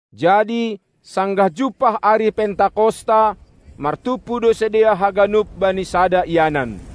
Jadi sanggah jumpah ari Pentakosta, martumpu do sidea haganup bani sada ianan.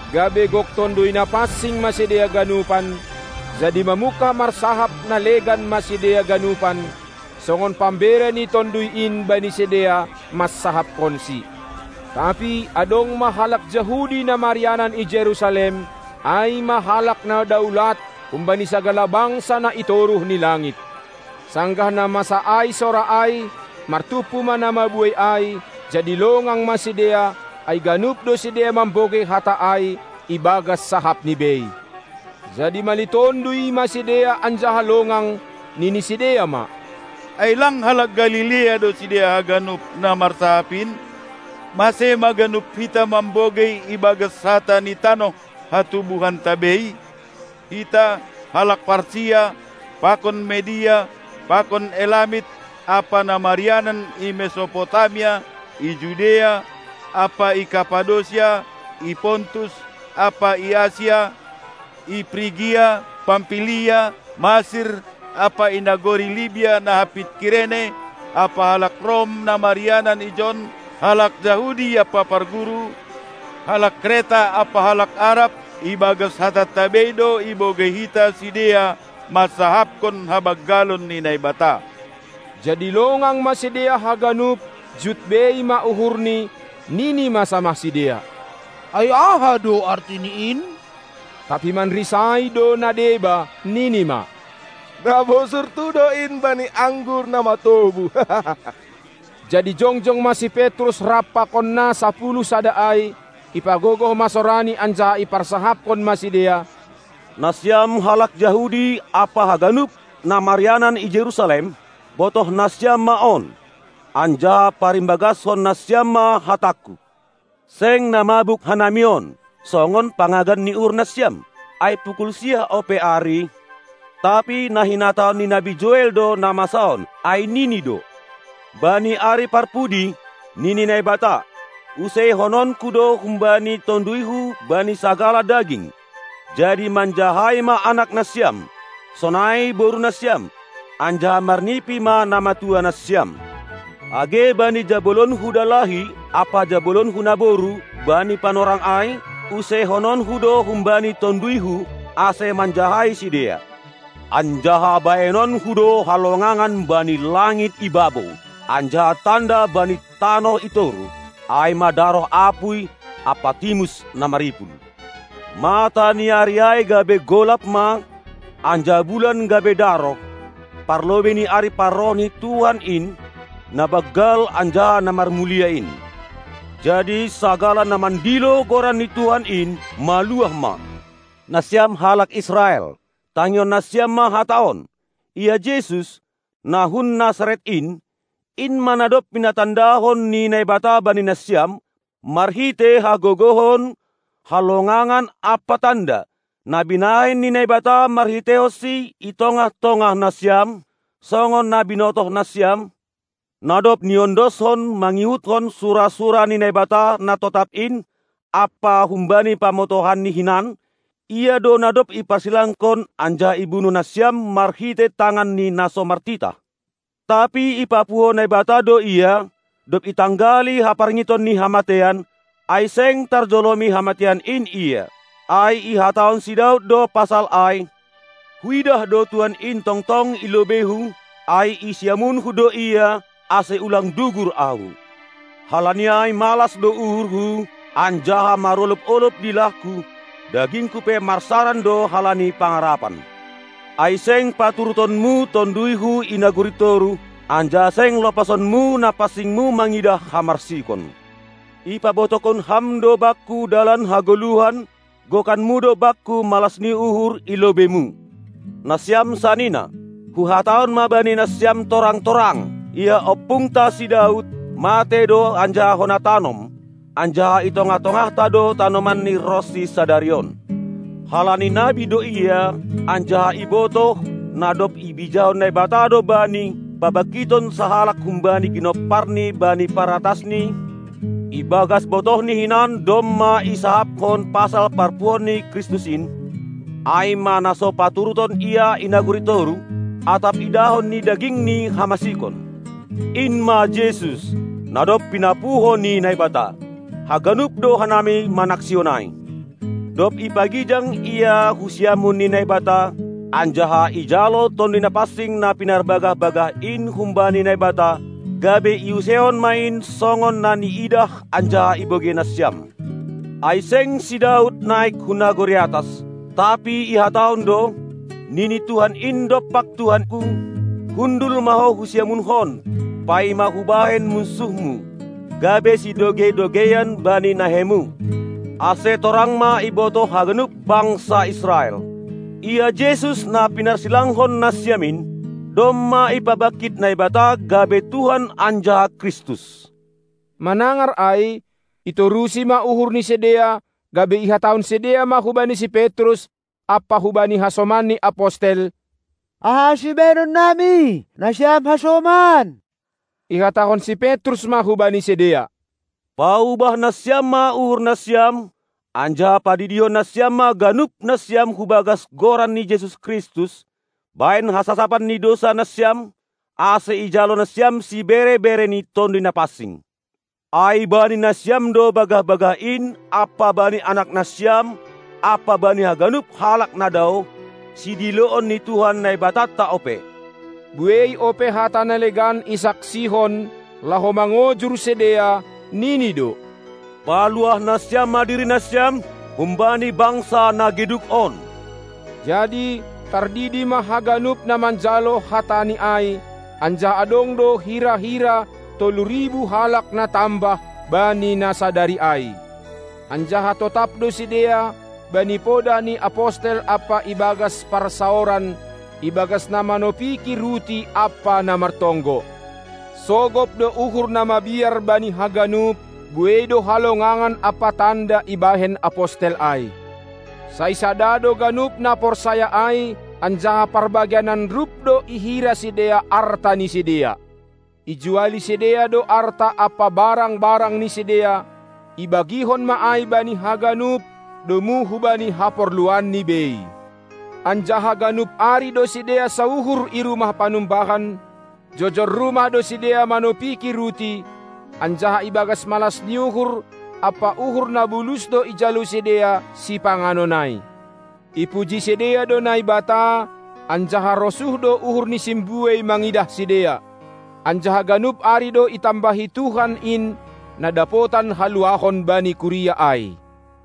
Gabe gok Tonduy Napansing ma sidea ganupan, jadi mamungkah marsahap na legan ma sidea ganupan, songon pambere ni Tonduy in bani sidea mansahapkonsi. Tapi adong ma halak Jahudi na marianan i Jerusalem, ai ma halak na daulat humbani sagala bangsa na i toruh ni langit. Sanggah na masa ai sora ai, martumpu ma na mabuei ai; jadi longang ma sidea, ai ganup do sidea mambogei hata ai ibagas sahapni bei. Jadi malitonduy ma sidea anjaha longang, nini sidea ma: Ai lang halak Galilea do sidea haganup na marsahap in? Mase ma ganup hita mambogei ibagas hata ni tanoh hatubuhanta bei? Hita, halak Partia pakon Media pakon Elamit ampa na marianan i Mesopotamia, i Judea ampa Kappadosia, i Pontus ampa i Asia, i Prigia, Pampilia, Masir ampa i nagori Libia na hampit Kirene, ampa halak Rom na marianan ijon, halak Jahudi ampa parguru, halak Kreta ampa halak Arab; ibagas hatanta bei do ibogei hita sidea mansahapkon habanggalon ni Naibata. Jadi longang ma sidea haganup, jut bei ma uhurni, nini ma samah sidea: Ai aha do artini in? Tapi manrisai do na deba, nini ma: Na bosurtu do in bani anggur na matobu. Jadi jongjong ma si Petrus rap pakon na sapuluh sada ai, ipagogoh ma sorani anjaha iparsahapkon ma sidea: Nasiam halak Jahudi ampa haganup na marianan i Jerusalem, botoh nasiam ma on, anjaha parimbagaskon nasiam ma hatangku! Seng na mabuk hanami on, songon pangagan ni uhur nasiam, ai pukul siah ope ari, tapi na hinatahon ni nabi Joel do na masa on, ai nini do: Bani ari parpudi, nini Naibata, useihononKu do humbani TonduyHu bani sagala daging, jadi manjahai ma anak nasiam, sonai borunasiam, anjaha marnipi ma namatua nasiam. Age bani jabolonKu dalahi ampa jabolonKu naboru bani panorang ai, useihononKu do humbani TonduyHu, ase manjahai sidea. Anjaha bahenonKu do halongangan bani langit i babou, anjaha tanda bani tanoh i toruh, ai ma daroh apuy ampa timus na maripul. Mataniari ai gabe golap ma, anjaha bulan gabe daroh, parlobei ni ari parroh ni Tuhan in, na banggal anjaha na marmulia in. Jadi sagala na mandilo Goran ni Tuhan in, maluah ma. Nasiam halak Israel, tangihon nasiam ma hata on: Ia Jesus, na hun Nasaret in, in ma na dob pinatandahon ni Naibata bani nasiam marhitei hagogohon, halongangan ampa tanda, na binahen ni Naibata marhiteihonSi i tongah-tongah nasiam, songon na binotohnasiam, na dob niondoskon mangihutkon sura-sura ni Naibata na totap in ampa humbani pamotohanNi hinan, Ia do na dob iparsilangkon anjaha ibunuh nasiam marhitei tangan ni na so martitah. Tapi ipapuho Naibata do Ia, dob itanggali haparngiton ni hamateian, ai seng tarjolomi hamateian in Ia. Ai ihatahon si Daud do pasal ai: Huidah do Tuhan in tongtong i lobeihu, ai i siamunhu do Ia, ase ulang dugur ahu. Halani ai malas do uhurhu, anjaha marolob-olob dilahku; dagingku pe marsaran do halani pangarapan. Ai seng paturuton-Mu tonduyhu i nagori toruh, anjaha seng lopason-Mu na pansing-Mu mangidah hamarsikon. Ipabotohkon Ham do bakku dalan hagoluhan, gokan-Mu do bakku malas ni uhur i lobei-Mu. Nasiam sanina, huhatahon ma bani nasiam torang-torang, ia ompungta si Daud matei do anjaha hona tanom, anjaha i tongah-tongahta do tanomanni ronsi sadari on. Halani nabi do ia, anjaha ibotoh, na dob ibijahon Naibata do bani, pabangkiton sahalak humbani ginomparni bani paratasni, ibagas botohni hinan domma isahapkon pasal parpuhoon ni Kristus in, ai ma na so paturuton Ia i nagori toruh, atap idahon ni dagingni hamasikon. In ma Jesus, na dob pinapuho ni Naibata, haganup do hanami manaksihon ai. Dob ipagijang Ia hu siamun ni Naibata, anjaha ijalo Tonduy Napansing na pinarbagah-bagah in humbani Naibata, gabe iuseihon ma in songon na niidah anjaha ibogei nasiam. Ai seng si Daud naik hu nagori atas, tapi ihatahon do: Nini Tuhan in dompak Tuhanku: Hundul ma Ho hu siamun-Hon, paima Hubahen munsuh-Mu, gabe sidogei-dogeian bani nahei-Mu. Ase torang ma ibotoh haganup bangsa Israel: Ia Jesus na pinarsilangkon nasiam in, domma ipabangkit Naibata gabe Tuhan anjaha Kristus. Manangar ai, itorusi ma uhur ni sidea, gabe ihatahon sidea ma hubani si Petrus ampa hubani hasomanni Apostel: Aha ma sibahenonnami, nasiam hasoman! Ihatahon si Petrus ma hubani sidea: Paubah nasiam ma uhurnasiam, anjaha padidihon nasiam ma ganup nasiam hubagas Goran ni Jesus Kristus, bahen hasasapan ni dousanasiam, ase ijalo nasiam sibere-bere ni Tonduy Napansing. Ai bani nasiam do bagah-bagah in ampa bani anaknasiam ampa bani haganup halak na daoh, sidiloon ni Tuhan Naibatanta ope. Buei ope hata na legan isaksihon, laho mangojur sidea, nini do: Paluah nasiam ma diri nasiam, humbani bangsa na geduk on! Jadi tardidi ma haganup na manjalo hatani ai, anjaha adong do hira-hira tolu ribu halak na tambah bani na sadari ai. Anjaha totap do sidea bani podah ni apostel ampa ibagas parsaoran, ibagas na manopiki ruti ampa na martonggo. Sogop do uhur na mabiar bani haganup; buei do halongangan ampa tanda ibahen apostel ai. Sai sada do ganup na porsaya ai, anjaha parbagianan rup do ihira sidea arta ni sidea. Ijuali sidea do arta ampa barang-barang ni sidea, ibagihon ma ai bani haganup, domu hubani haporluanni bei. Anjaha ganup ari do sidea sauhur i rumah panumbahan; jojor rumah do sidea manopiki ruti, anjaha ibagas malas ni uhur ampa uhur na bulus do ijalo sidea sipanganon ai. Ipuji sidea do Naibata anjaha rosuh do uhur ni simbuei mangidah sidea. Anjaha ganup ari do itambahi Tuhan in na dapotan haluahon bani kuria ai.